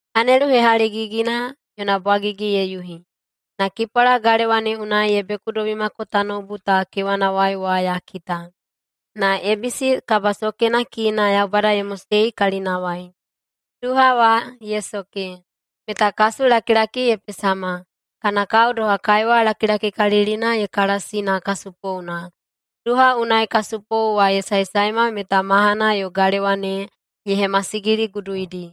Anelu hehaligigina yona bwagigi ye yuhi, na kipwala galewa ne unai ye bekudobimako tanoubu ta kewanawai wa ya kita. Na ebisi kabasokena kiina Yaubada ye mosei kalinawai. Duha wa ye soke, meta kasulakilaki ye pesama, kana kao doha kaiwa lakilakikalilina ye kalasi na kasupouna. Duha unai kasupou wa ye saesaema meta mahana yo galewa ne ye hemasigiliguduidi.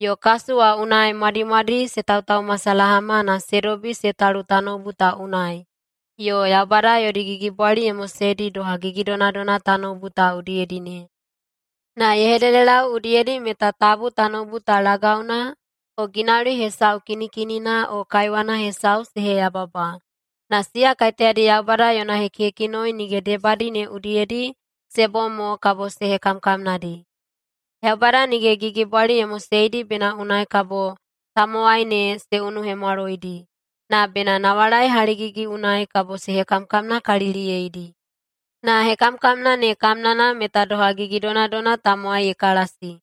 Yo kasu wa unai mwadimwadi se tautaumasalahama na se dobi se talu tanoubu ta unai yo Yaubada yodi gigibwali ye moseidi doha gigidonadona tanoubu ta udiyedi ne. Na ye hededelau udiyedi meta tabu tanoubu ta lagauna o ginauli hesau kinikinina o kaiwana hesau se heyababa, na siya kaiteyadi Yaubada yona hekihekinoi nige debadi ne udiyedi se bom mo kabo se hekamkamnadi. Yaubada nige gigibwali ye moseidi bena unai kabo tamowai ne se unuhemwaloidi, na bena nawalai haligigi unai kabo se hekamkamnakaliliyeidi. Na hekamkamna ne kamnana meta doha gigidonadona tamowai ye kalasi.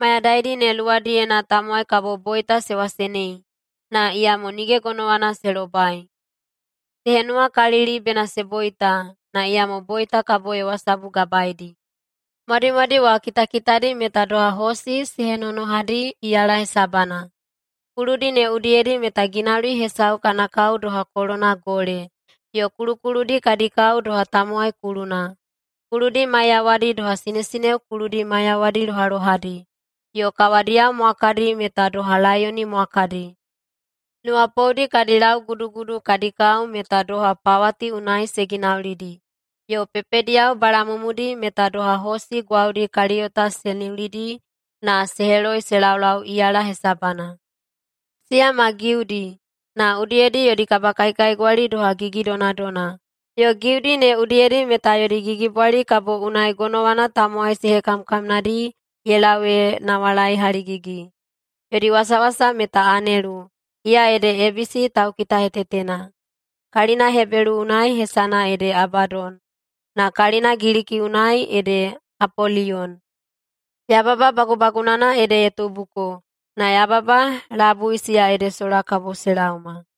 Mayadaidi ne luwadiyena tamowai kabo boita se wasenei, na iyamo nige gonowana se lobai. Se henuwakalili bena se boita, na iyamo boita kabo ye wasabugabaedi. Mwadimwadi wa kitakitadi meta doha hosi se henonohadi iyala hesabana. Kuludi ne udiyedi meta ginauli hesau kana kao doha kolona gole, yo kulukuludi kadi kao doha tamowai kuluna. Kuludi maiyawadi doha sinesineo kuludi maiyawadi lohalohadi, yo kawadiyao mwakadi meta doha laiyoni mwakadi. Nuwapoudi kadi laugudugudu kadi kao meta doha pawati unai se ginaulidi, yo pepediyao balamumudi meta doha hosi gwaudi kaliyota se niulidi na se heloi se laulau iyala hesabana. Siya ma giudi na udiyedi yodi kabakaikaigwali doha gigidonadona, yo giudi ne udiyedi meta yodi gigibwali kabo unai gonowana tamowai se hekamkamnadi ye lau ee nawalai haligigi. Yodi wasawasa meta anelu, iya ede ebisi taukitahetetena. Kalina Hebelu unai hesana ede Abadon, na kalina Giliki unai ede Apoliyon. Yababa bagubagunana ede ye tubuko, na yababa labui siya ede sola kabo se laoma.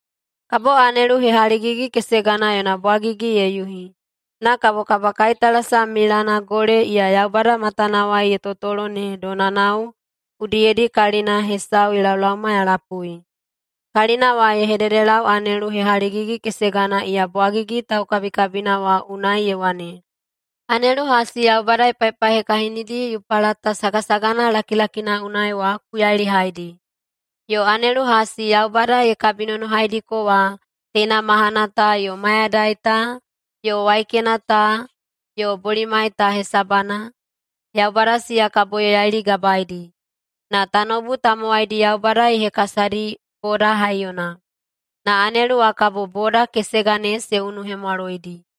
Kabo anelu hehaligigi-kesegana yona bwagigi ye yuhi, na kabo kabakaitalasam milana gole iya Yaubada matanawai ye totolo ne donanao udiyedi kalina hesau ye laolaoma ya lapui. Kalina wa ye hededelau anelu hehaligigi-kesegana iya bwagigi taukabikabina wa unai ye wane, “Anelu hasi Yaubada ye paipaihekahinidi Yupalata sagasagana lakilakina unai wa ku yailihaidi.” Yo anelu hasi Yaubada ye kabinonohaidiko wa teina mahana ta yo mayadai ta yo waikena ta yo bolimai ta hesabana, Yaubada siya kabo ye yailigabaedi. Na tanoubu tamowaidi Yaubada ye hekasadi boda haiyona, na anelu wa kabo boda kesega ne se unuhemwaloidi.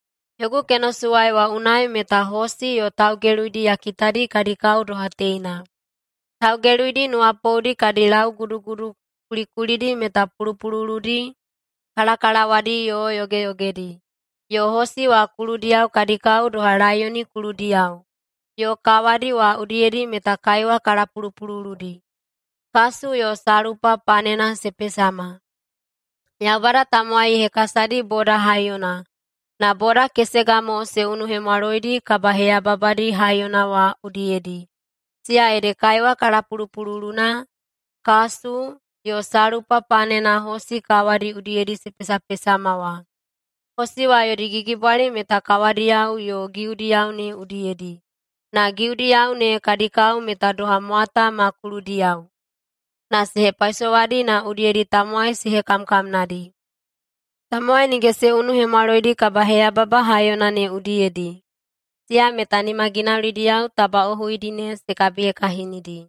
Yogu kenosuwai wa unai meta hosi yo taugeluidi ya kitadi kadi kao doha teina: Taugeluidi nuwapoudi kadi laugudugudu kulikulidi meta pulupululudi, kalakalawadi yo yogeyogedi. Yo hosi wa kuludiyao kadi kao doha laiyoni kuludiyao yo kawadi wa udiyedi meta kaiwa kalapulupululudi, kasu yo salpa panena se pesama. Yaubada tamowai ye hekasadi boda haiyona na boda kesega mo se unuhemwaloidi kabaheyababadi haiyona wa udiyedi, siya ede kaiwa kalapulupululuna, kasu, yo salpa panena hosi kawadi udiyedi se pesapesama wa. Hosi wa yodi gigibwali meta kawadiyao yo giudiyao ne udiyedi, na giudiyao ne kadi kao meta doha mwata ma kuludiyao, na se hepaisowadi na udiyedi tamowai se hekamkamnadi. Tamowai nige se unuhemwaloidi kabaheyababa haiyona ne udiyedi, siya meta nimaginaulidiyao tabaꞌohuidi ne se kabihekahinidi.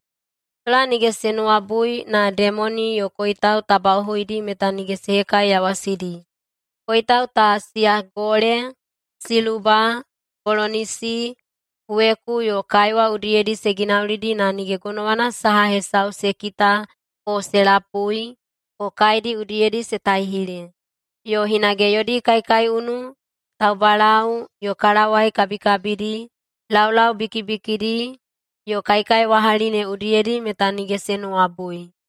Sola nige se nuwabui na demoni yo koitau tabaꞌohuidi meta nige se hekaiyawasidi. Koitau ta, siya gole, siluba, bolonisi, weku yo kaiwa udiyedi se ginaulidi na nige gonowana saha hesau se kita o se lapui o kaedi udiyedi se taihile. Yo hinage yodi kaikaiunu, taubalau yo kalawai kabikabidi, laulau bikibikidi yo kaikaiwahali ne udiyedi meta nige se nuwabui.